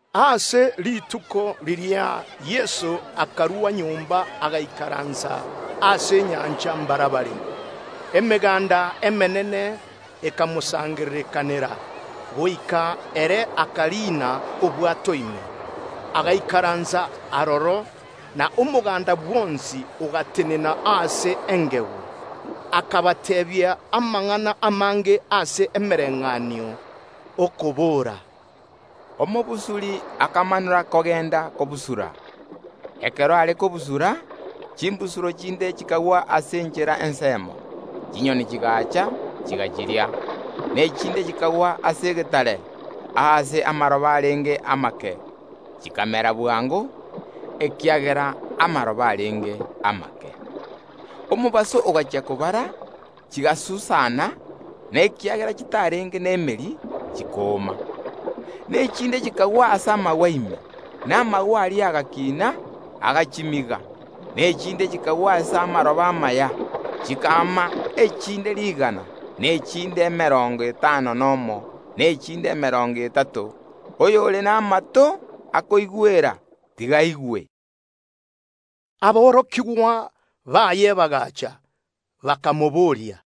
Ase rituko riria riria Yeso akarua nyomba agaikaransa ase enyancha mbarabare. Emeganda emenene ekamosangererekanera, goika ere akariina obwato ime, agaikaransa aroro, na omoganda bwonsi ogatenena ase engegu. Akabateebia amang’ana amange ase emebayeeno, okobora, “Omobusuri akamanora kogenda kobusura. Ekero are kobusura, chimbusuro chinde chikagwa ase enchera ensemo, chinyoni chigaacha, chigachiria, na echinde chikagwa ase egetare, aase amaroba arenge amake; chikamera bwango, ekiagera amaroba arenge amake. Omobaso ogachia kobara, chigasusana, na ekiagera chitarenge nemeri, chikooma. Na echinde chikagwa ase amagwa ime, na amagwa aria agakiina, agachimiga. Na echinde chikagwa ase amaroba amaya, chikaama echinde rigana, na echinde emerongo etano nomo, na echinde emerongo etato. Oyore namato akoigwera, tiga aigwe!” Aborokigwa baye bagaacha, bakamoboria,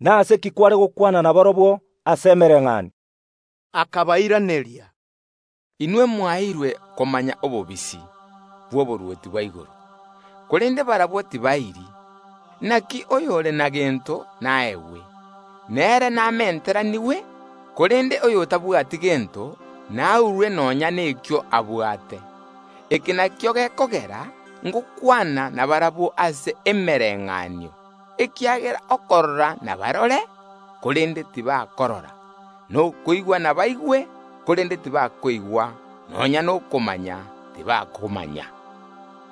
“Nase ki kware gokwana nabarabwo ase emebayeeno?” Akabairaneria, Inwe mwaeirwe komanya obobisi bw’oborwoti bwa igoro, korende barabwo tibaeiri. Inaki oyore na gento naegwe, nere namenteranigwe; korende oyotabwati gento naurwe nonya nkeria abwate. Eke nakio gekogera ngokwana nabarabwo ase emebayeeno, ekiagera okorigereria ’nabarigererie, korende tibakorora, na ogotegerera nabategerere, korende tibakoigwa, nonya nokomanya, tibakomanya.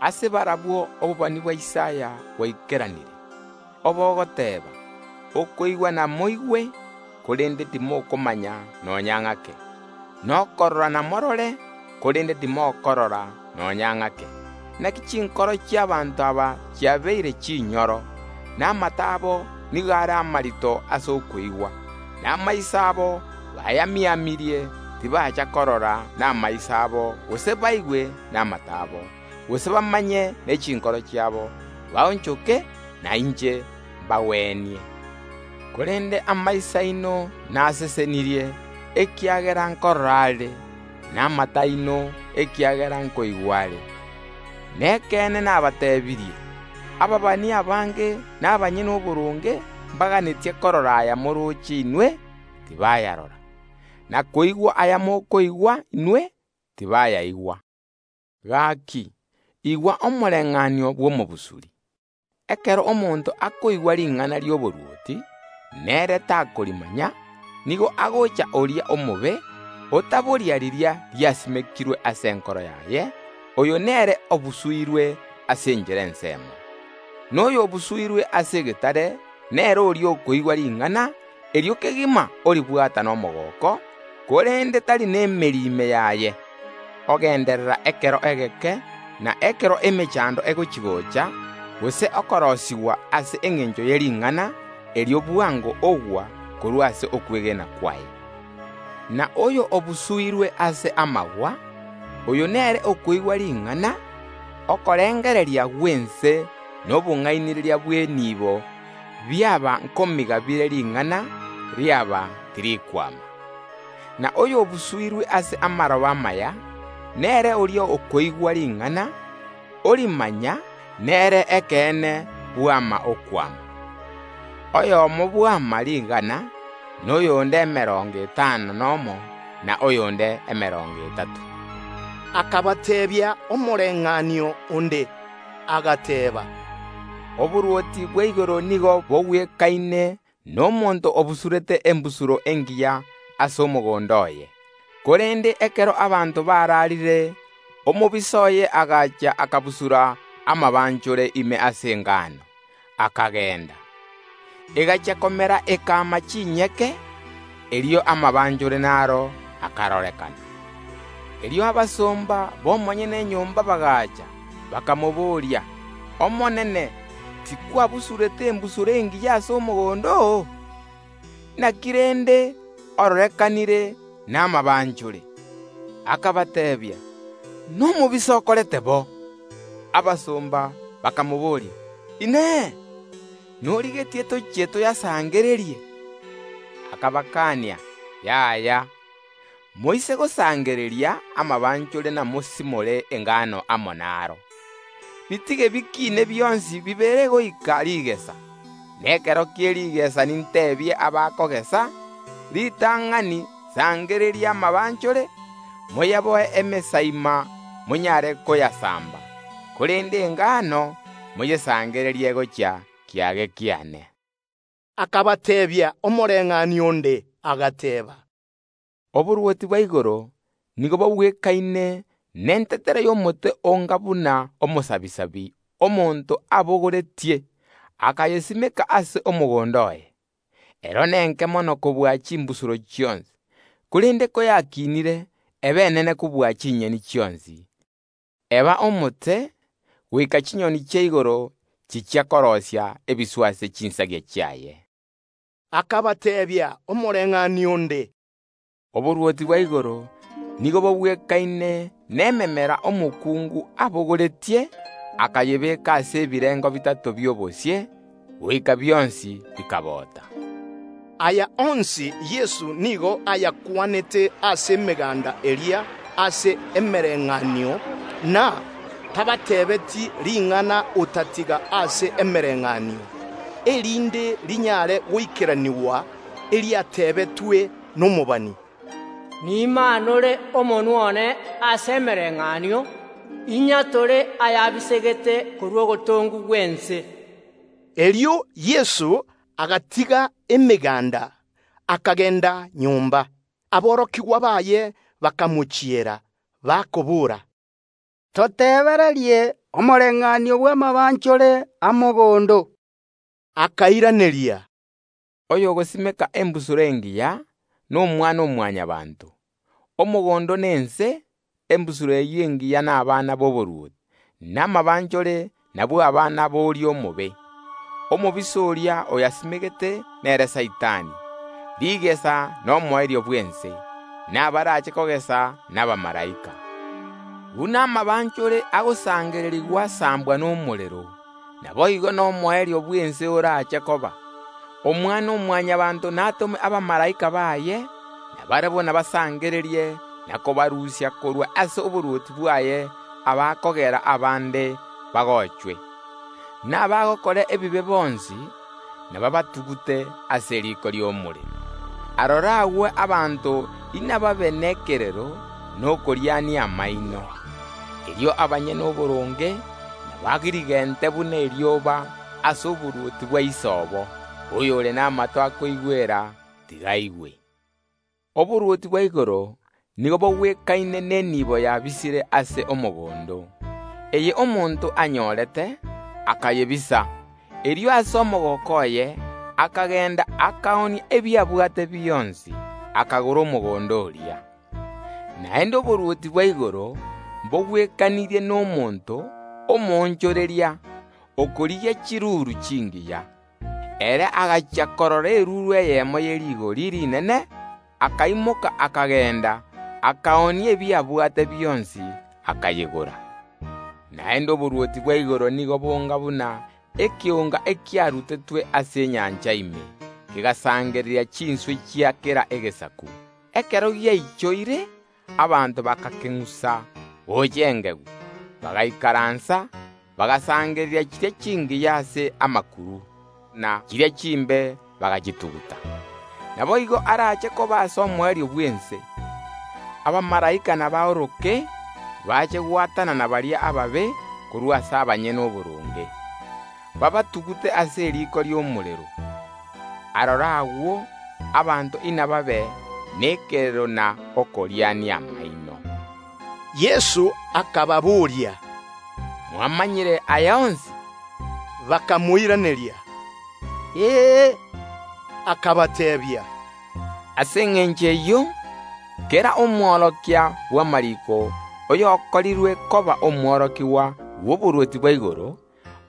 Ase barabwo obobani bwa Isaya bwaikeranire, obogoteeba: Okoigwa namoigwe, korende timokomanya nonya ng’ake, na okorigereria namorigererie, korende timokorora nonya ng’ake. Inaki chinkoro chi’ abanto aba chiabeire chinyoro, na amato abo nigo are amarito ase okoigwa, na amaiso abo bayamiamirie, tibacha korora namaiso abo gose koigwa namato abo, gose bamanye ne chinkoro chiabo, baonchoke, na inche mbagwenie. Korende amaiso aino nasesenirie, ekiagera nkorora are, na amato aino, ekiagera nkoigwa are. Nekeene nabateebirie: Abaabani abange na abanyene oboronge mbaganetie korora aya morooche inwe, tibayarora, na koigwa aya mokoigwa inwe, tibayaigwa. “Gaki, igwa omobayeeno bw’omobusuri. Ekero omonto akoigwa ring’ana ri’oborwoti, na ere takorimanya, nigo agocha oria omobe, otaboria riria riasimekirwe ase enkoro yaye, oyo nere obusuirwe ase enchera ensemo. Na oyo obusuirwe ase egetare nere oria okoigwa ring’ana, erio kegima oribwata nomogooko, korende tari nemeri ime yaye, ogenderera ekero egeke; na ekero emechando egochi‐gocha, gose okorosigwa ase engencho ye ring’ana, erio bwango ogwa korwa ase okwegena kwaye. Na oyo obusuirwe ase amagwa, oyo nere okoigwa ring’ana; okorengereria gw’ense na obong’ainereria bw’eniibo biaba nkomiga bire ring’ana, riaba tirikwama. Na oyo obusuirwe ase amaroba amaya, nere oria okoigwa ring’ana, orimanya; nere ekeene bwama okwama. Oyomo bwama rigana, na oyonde emerongo etano nomo, na oyonde emerongo etato.” Akabateebia omobayeeno onde, agateeba, “Oborwoti bwa igoro nigo bogwekaine nomonto obusurete embusuro engiya ase omogondo oye; korende ekero abanto bararire, omobisa oye agacha akabusura amabanchore ime ase engano, akagenda. Egachia komera ekama chinyeke, erio amabanchore naro akarorekana. Erio abasomba b’omonyene enyomba bagaacha, bakamobooria: Omonene, tikwabusurete embusuro engiya ase omogondo oo? Inaki rende ororekanire namabanchore? Akabateebia: Nomobisa okorete ayio. Abasomba bakamobooria: Inee! Norigetie tochie toyasimore? Akabakania: Yaya; moise koyasimora amabanchore namoiye engano amo naro. Bitige bikiine bionsi bibere goika rigesa, na ekero kie rigesa ninteebie abakogesa: Ritang’ani sangereria amabanchore, moyaboe emesaima monyare koyasamba; korende engano moyesangererie gochia kiage kiane.” Akabateebia omobayeeno onde, agateeba, “Oborwoti bwa igoro nigo bogwekaine nentetere y’omosirapi omonto abogoretie, akayesimeka ase omogondo oye; ero nenke mono kobua chimbusuro chionsi, korende koyakiinire yaba enene kobua ebimeri bionsi, eba omote, goika chinyoni chia igoro chichia koroisia ebiswa ase chinsagia chiaye.” Akabateebia omobayeeno onde, “Oborwoti bwa igoro nigo bogwekaine nememera omokungu abogoretie, akayebeka ase ebirengo bitato bi’obosie, goika bionsi bikabota.” Aya onsi Yeso nigo ayakwanete ase emeganda eria ase emereng’anio; na tabateebeetie ring’ana otatiga ase emebayeeno, erinde rinyare goikeranigwa eriatebetwe nomobani, “Nimaanore omonwa one ase emebayeeno, inyatore ayabisegete korwa ogotongwa gw’ense.” Erio Yeso agatiga emeganda, akagenda nyomba. Aborokigwa baye bakamochiera, bakobora, “Totebererie omobayeeno bw’amabanchore a mogondo.” Akairaneria, “Oyogosimeka embusuro engiya n’Omwana-o-Mwanyabaanto; omogondo nense; embusuro eyio engiya nabana b’oborwoti; na amabanchore nabwo abana boria omobe. Omobisa oria oyasimegete nere Saitani; rigesa nomoerio bw’ense, na abaraache kogesa nabamalaika. Buna amabanchore agosangererigwa asambwa nomorero, naboigo nomoerio bw’ense orache koba. Omwana-o-Mwanyabaanto natome abamalaika baye, na barabwo nabasangererie na kobarusia korwa ase oborwoti bwaye abakogera abande bagochwe, na abagokora ebibe bonsi, nababatugute ase eriiko ri’omorero. Aroro agwo abanto inababe nekerero na okoriania amaino. Erio abanyene oboronge nabagirigente buna erioba ase oborwoti bwa Ise obo. Oyore namato akoigwera, tiga aigwe. “Oborwoti bwa igoro nigo bogwekaine neniibo yabisire ase omogondo, eye omonto anyorete, akayebisa; erio ase omogooko oye akagenda, akaoonia ebi abwate bionsi, akagora omogondo oria. “Naende oborwoti bwa igoro mbogwekanirie nomonto omoonchoreria, okorigia chiruru chingiya. Ere agachia korora eruru eyemo ye rigori rinene, akaimoka akagenda, akaoonia ebi abwate bionsi, akayegora. “Naende oborwoti bwa igoro nigo bonga buna ekeonga ekiarutetwe ase enyancha ime, kegasangereria chinswe chia kera egesaku. Ekero giaichoire, abanto bagakeng’usa gocha engegu; bagaikaransa, bagasangereria chiria chingiya ase amakuru, na chiria chimbe bagachituguta. Naboigo eraache koba ase omoerio bw’ense. Abamalaika nabaoroke bache gwatanana baria ababe korwa ase abanyene oboronge, babatugute ase eriiko ri’omorero. Aroro agwo abanto inababe nekerero na okoriania amaino.” Yeso akababoria, “Mwamanyire aya onsi?” Bakamoiraneria, “Ee.” Akabateebia, “Ase engencho eyio kera Omwarimu bw’amariiko oyokorirwe koba omworokigwa bw’oborwoti bwa igoro,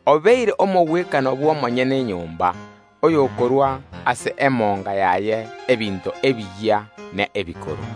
obeire omogwekano bw’omonyene enyomba, oyokorua ase emonga yaye ebinto ebiyia na ebikoro.”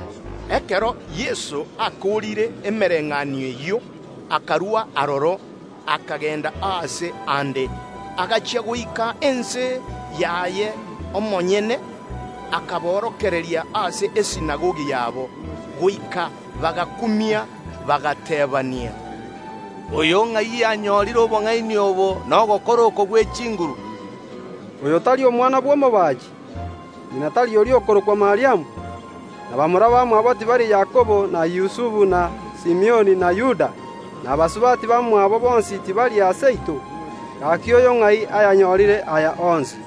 Ekero Yeso akoorire emebayeeno eyio, akarua aroro, akagenda aase aande. Agachia goika ense yaye omonyene, akaborokereria ase esinagogi yabo, goika bagakumia, bagateebania, “Oyo ng’ai anyorire obong’aini obo na ogokora oko gwe chinguru? Oyo tari omwana bw’omobaachi? Ngi’na tari oria okorokwa Mariamu? Na bamura bamwabo tibari Yakobo, na Yusufu na Simioni, na Yuda? Na basubati bamwabo bonsi tibari aa seito? Gaki oyo ng’ai ayanyorire aya onsi?”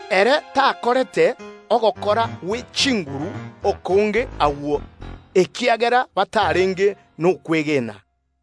Ere takorete amakumia amange agwo, ekiagera batarenge nokwegena.